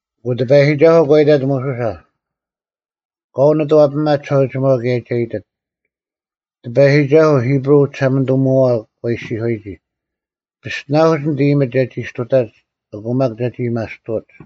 ᐊᑯ ᑎᐸᔨᒋᒐᓱᐤ ᒂ ᐃᑕᑦ ᒧᓱᓴ, “ᑲᐤ ᓂᑐᐛᐱᒪ ᒋᓴᐅᒋᒪᐤ ᑭᔭ ᒐ ᐃᑎᑦ, ‘ᑎᐸᔨᒋᒐᓱᐤ ᐃᑉᕈᐤ ᐅᒋᓴᒪᓂᑐᒧᐛᐛ ᒂ ᐃᔅᒋᔄᔨᒋ “ᐱᔅᑎᓇᐧᑯᒡ ᓂᑦ ᐃᔨᒥᒡ ᒐᒋ ᔅᑐᑕᒡ ᐊᑯ ᒪᒃ ᒐᒋ ᐊᔭᒥᐊᔅᑐᐅᒡ᙮”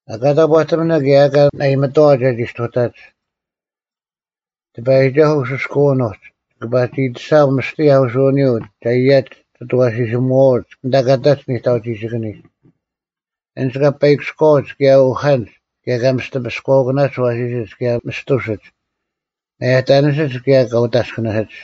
ᐊᑲ ᑕᑈᑎᒥᓇ ᑭᔭ ᐊ ᐊᑲ ᓇᐃᒥᑥᐛ ᒐᒋ ᔅᑐᑕᒡ, ᑎᐸᔨᒋᒐᓱᐤ ᐅᓱᐧᑲᑎᓯᐅᓐ ᐅᒡ ᒋᑭ ᐸᒋ ᐃᑎᓴᒻ ᒥᔅᑎ ᐊᐧᑯᓱᐅᓂᔪᐤ ᒐ ᐃᔭᒡ ᒋᑦ ᐊᐛᓯᓯᒧᐛᐅᒡ ᐊᓐᑕ ᑲ ᑕᒡ ᓂᑕᐅᒋᒋᑭᓂᒡ᙮ ᐊᓐᒡ ᑲᐸᐃᑭᔎᐅᒡ ᑭᔭ ᐅᐧᑲᓐᒡ ᑭᔭ ᑲ ᒥᔅᑎ ᐱᔎᐅᑯᓇᒡ ᐊᐛᓯᓯᒡ ᑭᔭ ᒥᔅᑐᓯᒡ, ᒪᔭᑕᓂᓯᒡ ᑭᔭ ᑲ ᐅᑦ ᐊᔅᑭᓂᓯᒡ᙮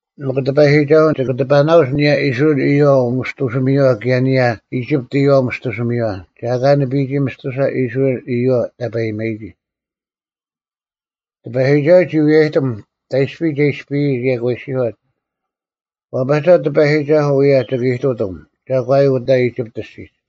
ᒥᒄ ᑎᐸᔨᒋᒐᓱᐤ ᒋᑭ ᑎᐸᓇᐅᒡ ᐊᓂᔭ ᐃᔅᕋᐃᓪ ᐃᔪᐛ ᐅᒥᔅᑐᓯᒥᔪᐛ ᑭᔭ ᐊᓂᔭ ᐃᒋᑉᑦ ᐃᔪᐛ ᐅᒥᔅᑐᓯᒥᔪᐛ, ᒐ ᐊᑲ ᓂᐱᔨᒋ ᒥᔅᑐᓴ ᐃᔅᕋᐃᓪ ᐃᔪᐛ ᑕᐸᔨᒪᔨᒋ᙮’” ᑎᐸᔨᒋᒐᓱᐤ ᒋ ᐎᔨᔭᑎᒻ ᑕᐃᔅᐱ ᒐ ᐃᔅᐱᔨᒡ ᑭᔭ ᒂ ᐃᔅᒋᔄᑦ, “ᐛᐸᒐ ᑎᐸᔨᒋᒐᓱᐤ ᐅᔭ ᒋᑭ ᐃᑐᑎᒻ ᒐᒂᔪᐤ ᐅᑕ ᐃᒋᑉᑦ ᐊᔅᒋᒡ᙮”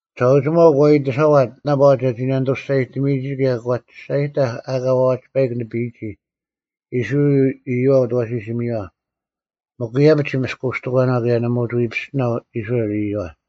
ᒋᓴᐅᒋᒪᐤ ᒂ ᐃᑎᓴᐛᑦ ᓇᐸᐛ ᒐᒋ ᓇᓂᑐ ᒋᔅᒐᔨᑎᒥᔨᒋ ᑭᔭ ᒂ ᒋᔅᒐᔨᑕᐧᒄ ᐊᑲ ᐛᐛᒡ ᐸᐃᒄ ᓂᐱᔨᒋ ᐃᔅᕋᐃᓪ ᐃᔪᐛ ᐅᑦ ᐊᐛᓯᓯᒥᔪᐛ᙮ ᒥᒄ ᐃᔭᐱᒡ ᒋ ᒥᔅᑯᔅᑎᒂᓇᐤ ᑭᔭ ᓇᒪ ᐅᒋ ᐎ ᐱᔅᑎᓇᐤ ᐃᔅᕋᐃᓪ ᐃᔪᐛ᙮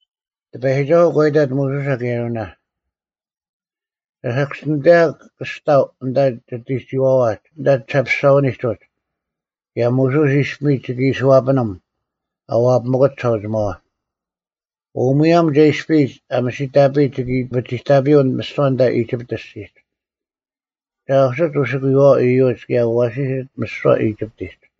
ᑎᐸᔨᒋᒐᓱᐤ ᒂ ᐃᑕᑦ ᒧᓱᓴ ᑭᔭ ᐊᕋᓇ, “ᒐ ᓴᑭᔅᒋᓂᑕᔨᒄ ᑭᔅᑕᐤ ᐊᓐᑕ ᒋᑎᒋᐛᐛᒡ ᐊᓐᑕ ᒋᓴᐱᔅᒐᐛᓂᒡ ᐅᒡ, ᑭᔭ ᒧᓱᔅ ᐃᔅᐱᒥᒡ ᒋᑭ ᐃᓯ ᐛᐱᓂᒻ ᐊ ᐛᐱᒥᑯᑦ ᒋᓴᐅᒋᒪᐛ᙮ ᐅ ᒧᔭᒻ ᒐ ᐃᔅᐱᔨᒡ ᐊ ᒥᓯᑕᐱᔨᒡ ᒋᑭ ᐱᒋᑕᐱᔪᐤ ᒥᓯᐛ ᐊᓐᑕ ᐃᒋᑉᑦ ᐊᔅᒋᒡ, ᒐ ᐊᐧᑯᓯᒡ ᐅᓯᑭᔪᐛᐛ ᐃᔪᒡ ᑭᔭ ᐊᐛᓯᓯᒡ ᒥᓯᐛ ᐃᒋᑉᑎᒡ᙮”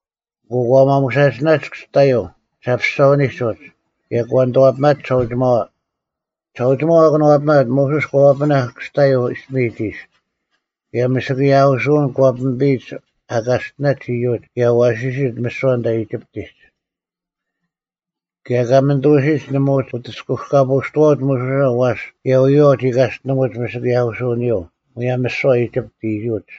ᐊᑯ ᑲ ᒪᒧᓴᒋᓇᒡ ᑭᔅᑕᔪᐤ ᒋᓴᐱᔅᒐᐛᓂᒡ ᐅᒋ ᑭᔭ ᒂ ᓂᑐᐛᐱᒪᒡ ᒋᓴᐅᒋᒪᐛ᙮ ᒋᓴᐅᒋᒪᐤ ᐊ ᑭᓄᐛᐱᒥᑦ, ᒧᓱᔅ ᒂ ᐛᐱᓇᐧᒃ ᑭᔅᑕᔪᐤ ᐃᔅᐱᒥᒡ ᐃᓯ, ᑭᔭ ᒥᓯᑭᔾ ᐊᐧᑯᓱᐅᓐ ᒂ ᐱᒥᐱᔨᒡ ᐊ ᑲᔅᑎᓇᒡ ᐃᔪᒡ ᑭᔭ ᐊᐛᓯᓯᒡ ᒥᓯᐛ ᐊᓐᑕ ᐃᒋᑉᑎᒡ᙮ ᑭᔭ ᑲᒥᓂᑐᐅᓯᒡ ᓇᒪ ᐅᒋ ᐅᑎᔅᑯᑲᐳᔅᑐᐛᐅᒡ ᒧᓱᓴ ᐛᔅ ᑭᔭ ᐎᔨᐛᐤ ᒋᑲᔅᑎᓂᒧᒡ ᒥᓯᑭᔾ ᐊᐧᑯᓱᐅᓂᔪᐤ ᒧᔭᒻ ᒥᓯᐛ ᐃᒋᑉᑦ ᐃᔪᒡ᙮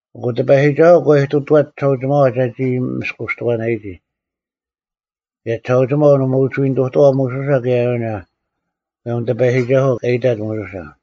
ᐊᑯ ᑎᐸᔨᒋᒐᓱᐤ ᒂ ᐃᑐᑐᐛᑦ ᒋᓴᐅᒋᒪᐛ ᒐᒋ ᒥᔅᑯᔅᑎᒂᓇᔨᒋ᙮ ᑭᔭ ᒋᓴᐅᒋᒪᐤ ᓇᒪ ᐅᒋ ᓂᑐᑐᐛᐤ ᒧᓱᓴ ᑭᔭ ᐊᕋᓇ, ᒧᔭᒻ ᑎᐸᔨᒋᒐᓱᐤ ᑲ ᐃᑕᑦ ᒧᓱᓴ᙮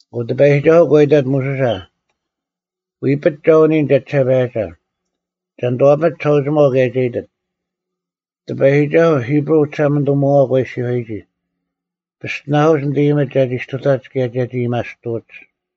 ᐊᑯ ᑎᐸᔨᒋᒐᓱᐤ ᒂ ᐃᑕᑦ ᒧᓱᓴ, “ᐎᐱᒡ ᒐ ᐅᓂᔨᓐ ᒐᒋᓴᐸᔭᒐ᙮ ᒐ ᓂᑐᐛᐱᒥᑦ ᒋᓴᐅᒋᒪᐤ ᑭᔭ ᒐ ᐃᑎᑦ, ‘ᑎᐸᔨᒋᒐᓱᐤ ᐃᑉᕈᐤ ᐅᒋᓴᒪᓂᑐᒧᐛᐛ ᒂ ᐃᔅᒋᔄᔨᒋ: “ᐱᔅᑎᓇᐧᑯᒡ ᓂᑦ ᐃᔨᒥᒡ ᒐᒋ ᔅᑐᑕᒡ ᑭᔭ ᒐᒋ ᐊᔭᒥᐊᔅᑐᐅᒡ᙮”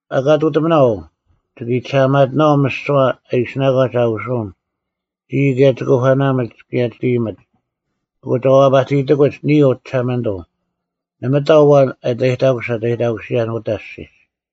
ᐊᑲ ᐃᑐᑎᒥᓇ ᐅ, ᒋᑭ ᐃᑎᓴᐊᒪᑎᓇᐛᐤ ᒥᓯᐛ ᐊ ᐃᓯᓇᒂᒡ ᐊᐧᑯᓱᐅᓐ ᒋᔾ ᑭᔭ ᒋᑯᐸᓇᒥᒡ ᑭᔭ ᒋᑦ ᐃᔨᒥᒡ᙮ ᐊᑯ ᒐ ᐎ ᐛᐸᑎᔨᑕᑯᒡ ᓂᔾ ᐅ ᒋᓴᒪᓂᑐᐤ ᓇᒪ ᑕᐤ ᐊᐛᓐ ᐊᑕᔨᑕᑯᓯᑦ ᐊᑕᔨᑕᑯᓯᔭᓐ ᐅᑕ ᐊᔅᒋᒡ᙮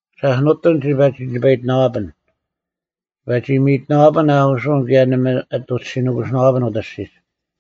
ᓴᔅ ᓄᑎᒻ ᒋᐸ ᒋ ᓂᐸᐃᑎᓇᐛᐱᓐ᙮ ᒋᐸ ᒋ ᒥᔨᑎᓇᐛᐱᓐ ᐊᐧᑯᓱᐅᓐ ᑭᔭ ᓇᒪ ᐊᑐᒡ ᔅᒋ ᓄᑯᓯᓇᐛᐱᓐ ᐅᑕ ᐊᔅᒋᒡ᙮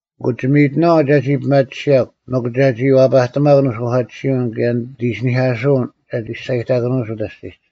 ᐊᑯ ᒋ ᒥᔨᑎᓇᐛᐤ ᒐᒋ ᐱᒪᑎᓯᔭᒄ ᒥᒄ ᒐᒋ ᐛᐸᑎᒪᒃ ᓂᓱᐧᑲᑎᓯᐅᓐ ᑭᔭ ᓂᑦ ᐃᓯᓂᐧᑲᓱᐅᓐ ᒐᒋ ᒋᔅᒐᔨᑕᑭᓄᐅᒡ ᐅᑕ ᐊᔅᒋᒡ᙮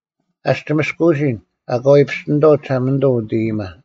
ᐊᔅᒄ ᒋ ᒥᔅᑯᐅᓯᓐ ᐊᑲ ᐎ ᐱᔅᑎᓂᑥᐤ ᒋᓴᒪᓂᑐᐤ ᐅᑦ ᐃᔨᒥᒪ᙮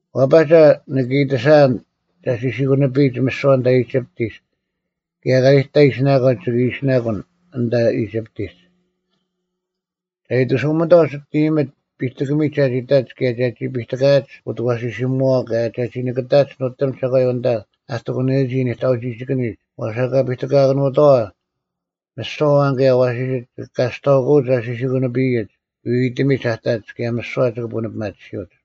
ᐛᐸᒐ, ᓂᑭ ᐃᑎᓴᐊᓐ ᒐ ᓯᓯᑯᓂᐱᔨᒡ ᒥᓯᐛ ᐊᓐᑕ ᐃᒋᑉᑎᒡ ᑭᔭ ᐊᑲ ᓂᑕ ᐃᓯᓇᒂᒡ ᒋᑭ ᐃᓯᓇᑯᓐ ᐊᓐᑕ ᐃᒋᑉᑎᒡ᙮ ᒐ ᐃᑎᓱᒥᑥᐤ ᒋᑦ ᐃᔨᒥᒡ ᐱᑎᑭᒥᒡ ᒐᒋ ᑕᒡ ᑭᔭ ᒐᒋ ᐱᑎᑲᐊᒡ ᐅᑦ ᐊᐛᓯᓯᒧᐛᐛ ᑭᔭ ᒐᒋ ᐱᑎᑭᑕᒡ ᓄᑎᒻ ᒐᒂᔪᐛ ᐊᓐᑕ ᐊ ᑎᑯᓂᔨᒋ ᓂᑕᐅᒋᒋᑭᓂᒡ ᐛᔅ ᐊᑲ ᐱᑎᑲᑭᓄᑥᐛ, ᒥᓯᐛ ᐊᐛᓐ ᑭᔭ ᐊᐛᓯᓯᒡ ᒋᑭ ᑲᔅᑕᐅᑯᐅᒡ ᐊ ᓯᓯᑯᓂᐱᔨᒡ ᐎᐎᑎᒥᒡ ᐊᑕᒡ ᑭᔭ ᒥᓯᐛ ᒋᑭ ᐳᓂᐱᒪᑎᓯᐅᒡ᙮’”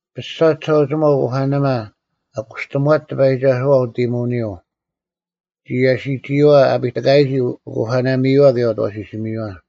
ᐱᔅᒐ ᒋᓴᐅᒋᒪᐤ ᐅᑯᐸᓇᒪ ᐊ ᑯᔅᑎᒺᒡ ᑎᐸᔨᒋᒐᓱᐛ ᐅᑦ ᐃᔨᒧᐅᓂᔪᐤ, ᒋ ᐃᔭᓯᒋᔨᐛ ᐊᐱᑎᑲᔨᒋ ᐅᑯᐸᓇᒥᔪᐛ ᑭᔭ ᐅᑦ ᐊᐛᓯᓯᒥᔪᐛ᙮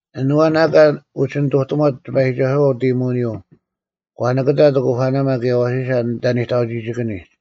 ᐊᑯ ᐊᓐ ᐊᐛᓐ ᐊᑲ ᐅᒋ ᓂᑐᑎᒺᑦ ᑎᐸᔨᒋᒐᓱᐛ ᐅᑦ ᐃᔨᒧᐅᓂᔪᐤ ᒂ ᓂᑭᑕᑦ ᐅᑯᐸᓇᒪ ᑭᔭ ᐊᐛᓯᓴ ᐊᓐᑕ ᓂᑕᐅᒋᒋᑭᓂᒡ᙮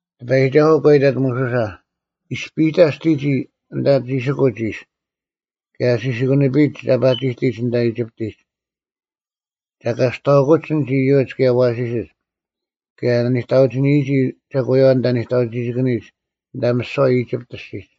ᑎᐸᔨᒋᒐᓱᐤ ᒂ ᐃᑕᑦ ᒧᓱᓴ, “ᐃᔅᐱᑕ ᔅᑎᒋᔾ ᐊᓐᑕ ᒋᓯᑯᒡ ᐃᔅ ᑭᔭ ᐊ ᓯᓯᑯᓂᐱᔨᒡ ᒐ ᐸᒋᑎᒡ ᐊᓐᑕ ᐃᒋᑉᑎᒡ᙮ ᒐ ᑲᔅᑕᐅᑯᒡ ᐊᓐᒡ ᐃᔪᒡ ᑭᔭ ᐊᐛᓯᓯᒡ ᑭᔭ ᐊ ᓂᑕᐅᒋᓂᔨᒋ ᒐᒂᔪᐛ ᐊᓐᑕ ᓂᑕᐅᒋᑭᓂᒡ ᐊᓐᑕ ᒥᓯᐛ ᐃᒋᑉᑦ ᐊᔅᒋᒡ᙮”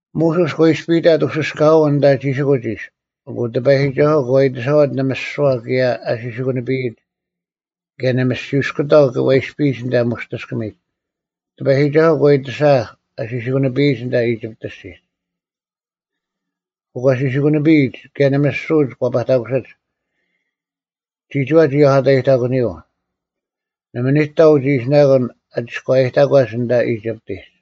ᒧᓱᔅ ᒂ ᐃᔅᐱᔨᑕᑦ ᐅᓯᔅᑲᐅᓐ ᐊᓐᑕ ᒋᓯᑯᒡ ᐃᔅ᙮ ᐊᑯ ᑎᐸᔨᒋᒐᓱᐤ ᒂ ᐃᑎᓴᐛᑦ ᓂᒥᔅᒋᐅᐛ ᑭᔭ ᐊ ᓯᓯᑯᓂᐱᔨᒡ᙮ ᑭᔭ ᓂᒥᔅᒋᐅᔅᑯᑕᐤ ᒂ ᐃᔅᐱᔨᒡ ᐊᓐᑕ ᒧᔅᑎᔅᑭᒥᒡ᙮ ᑎᐸᔨᒋᒐᓱᐤ ᒂ ᐃᑎᓴᐧᒃ ᐊ ᓯᓯᑯᓂᐱᔨᒡ ᐊᓐᑕ ᐃᒋᑉᑦ ᐊᔅᒋᒡ᙮ ᐊᑯ ᒂ ᓯᓯᑯᓂᐱᔨᒡ ᑭᔭ ᓂᒥᔅᒋᐅᒡ ᒂ ᐸᑕᑯᓯᒡ᙮ ᒋᒋᐛ ᒋ ᐊᒂᑕᔨᑕᑯᓂᔪᐤ, ᓇᒪ ᓂᑕ ᐅᒋ ᐃᓯᓇᑯᓐ ᐊ ᒋᔎᔨᑕᒂᒡ ᐊᓐᑕ ᐃᒋᑉᑎᒡ᙮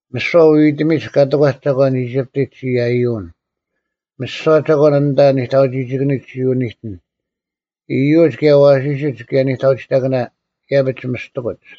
ᒥᓯᐛ ᐎᐎᑎᒥᒡ ᑲ ᑎᒂᒡ ᒐᒂᓐ ᐃᒋᑉᑎᒡ ᒋ ᐃᔭᔪᐅᓐ᙮ ᒥᓯᐛ ᒐᒂᓐ ᐊᓐᑕ ᓂᑕᐅᒋᒋᑭᓂᒡ ᒋ ᐅᓂᑎᓐ, ᐃᔪᒡ ᑭᔭ ᐊᐛᓯᓯᒡ ᑭᔭ ᓂᑕᐅᒋᒋᑭᓇ, ᐃᔭᐱᒡ ᒥᔅᑎᑯᒡ᙮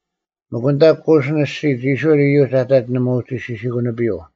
ᒥᒄ ᐊᓐᑕ ᑯᓯᓐ ᐊᔅᒋᒡ ᐃᔅᕋᐃᓪ ᐃᔪᒡ ᐊᑕᒡ ᓇᒪ ᐅᒋ ᓯᓯᑯᓂᐱᔪᐤ᙮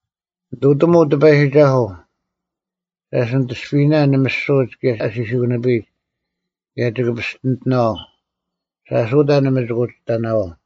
ᓂᑐᑎᒧᐤ ᑎᐸᔨᒋᒐᓱᐤ᙮ ᓴᔅ ᓂᑦ ᐃᔅᐱᔨᓇᓐ ᓂᒥᔅᒍᐅᒡ ᑭᔭ ᐊ ᓯᓯᑯᓂᐱᔨᒡ᙮ ᑭᔭ ᒋᑭ ᐱᔅᑎᓂᑎᓇᐛᐤ᙮ ᓴᔅ ᐅᑕ ᓇᒪ ᒋᑭ ᐅᒋ ᑕᓇᐛᐤ᙮”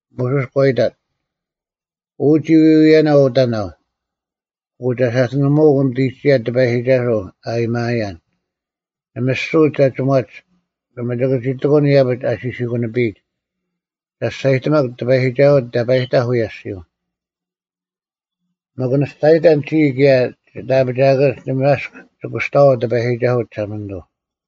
ᒧᓱᔅ ᒂ ᐃᑕᑦ, “ᐅ ᒋ ᐎᐎᔭᓇ ᐅᑕᓇᐤ, ᐊᑯ ᒐ ᓴᑐᓂᒧᐅᒃ ᓂᑎᒋᔭ ᑎᐸᔨᒋᒐᓱᐤ ᐊᔭᒥᐊᐃᔭᓐ᙮ ᓂᒥᔅᒍᐅᒡ ᒐ ᒋᒺᒡ᙮ ᓇᒪ ᒋᑭ ᒋ ᑎᑯᓐ ᐃᔭᐱᒡ ᐊ ᓯᓯᑯᓂᐱᔨᒡ᙮ ᐊᑯ ᒐ ᒋᔅᒐᔨᑎᒪᒄ ᑎᐸᔨᒋᒐᓱᐤ ᑕᐸᔨᑕᐧᒃ ᐅᔭ ᐊᔅᒋᔪᐤ᙮ ᒥᒄ ᓂ ᒋᔅᒐᔨᑕᓐ ᒋᔾ ᑭᔭ ᒋᑦ ᐊᐱᒋᐊᑭᓐᒡ ᓇᒪ ᐊᔅᒄ ᒋ ᑯᔅᑕᐛᐤ ᑎᐸᔨᒋᒐᓱᐤ ᒋᓴᒪᓂᑐᐤ᙮”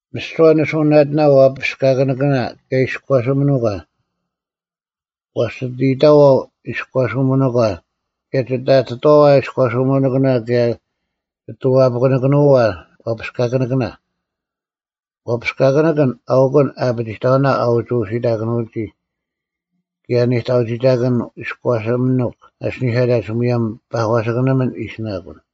ᒥᓯᐛ ᒋ ᓂᓱᐅᓇᑎᓇ ᐛᐱᔅᑲᑭᓂᑭᓇ ᑭᔭ ᐃᔎᓯᒥᓄᒂ, ᐛᔅ ᒋ ᐊᑎᑕᐛ ᐃᔎᓯᒥᓄᒂ ᑭᔭ ᒋ ᐊᑎ ᐛᐱᑯᓂᑭᓄᐛ ᐛᐱᔅᑲᑭᓂᑭᓇ᙮ (ᐛᐱᔅᑲᑭᓂᑭᓐ ᐊᐅᑯᓐ ᐊᐱᒋᑕᐅᓇ ᐊ ᐅᒋ ᐅᓯᑕᑯᓂᔨᒋ, ᑭᔭ ᓂᑕᐅᒋᑕᑭᓐ ᐃᔎᓯᒥᓄᒃ ᐊᓯᓂᐧᑲᑕᒡ ᒧᔭᒻ ᐸᒂᓯᑭᓂᒥᓐ ᐃᓯᓇᑯᓐ᙮)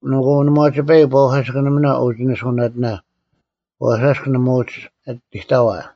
ᐊᑯ ᓇᒪ ᐛᒋ ᐸᐃᒄ ᐸᒂᓯᑭᓂᒥᓇ ᐅᒋ ᓂᓱᐅᓇᑎᓇ ᐛᔅ ᐊᔅᒄ ᓇᒪ ᐅᒋ ᐊᑎᑕᐛ᙮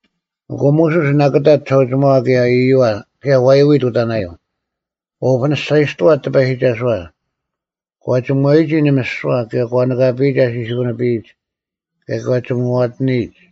ᐊᑯ ᒧᓱᔅ ᓇᑭᑕᑦ ᒋᓴᐅᒋᒪᐛ ᑭᔭ ᐛᔪᐎᑦ ᐅᑕᓇᔪᐤ᙮ ᒂ ᐅᐱᓂᔅᒐᔨᔅᑐᐛᑦ ᑎᐸᔨᒋᒐᓱᐛ, ᑲ ᒋᒺᔨᒋ ᓂᒥᔅᒍᐛ ᑭᔭ ᒂ ᓂᑲᐱᔨᒡ ᐊ ᓯᓯᑯᓂᐱᔨᒡ, ᑭᔭ ᒂ ᒋᒧᐛᑎᓂᔨᒡ᙮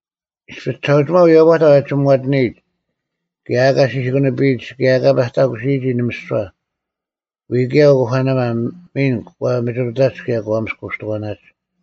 ᐃᔅᐱ ᒋᓴᐅᒋᒪᐤ ᐎᔭᐸᑕᐧᒃ ᐊ ᒋᒧᐛᑎᓂᔨᒡ ᑭᔭ ᐊᑲ ᓯᓯᑯᓂᐱᔨᒡ ᑭᔭ ᐊᑲ ᐸᑕᑯᓯᔨᒋ ᓂᒥᔅᒍᐛ, ᐎᔾ ᑭᔭ ᐅᑯᐸᓇᒪ ᒥᓐ ᒂ ᒥᒋᑐᑕᒡ ᑭᔭ ᒂ ᒥᔅᑯᔅᑎᒂᓇᒡ᙮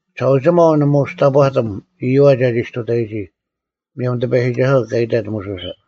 ᒋᓴᐅᒋᒪᐤ ᓇᒪ ᐅᒋ ᑕᑈᑎᒻ ᐃᔪᐛ ᒐᒋ ᔅᑐᑕᔨᒋ, ᒧᔭᒻ ᑎᐸᔨᒋᒐᓱᐤ ᑲ ᐃᑕᑦ ᒧᓱᓴ᙮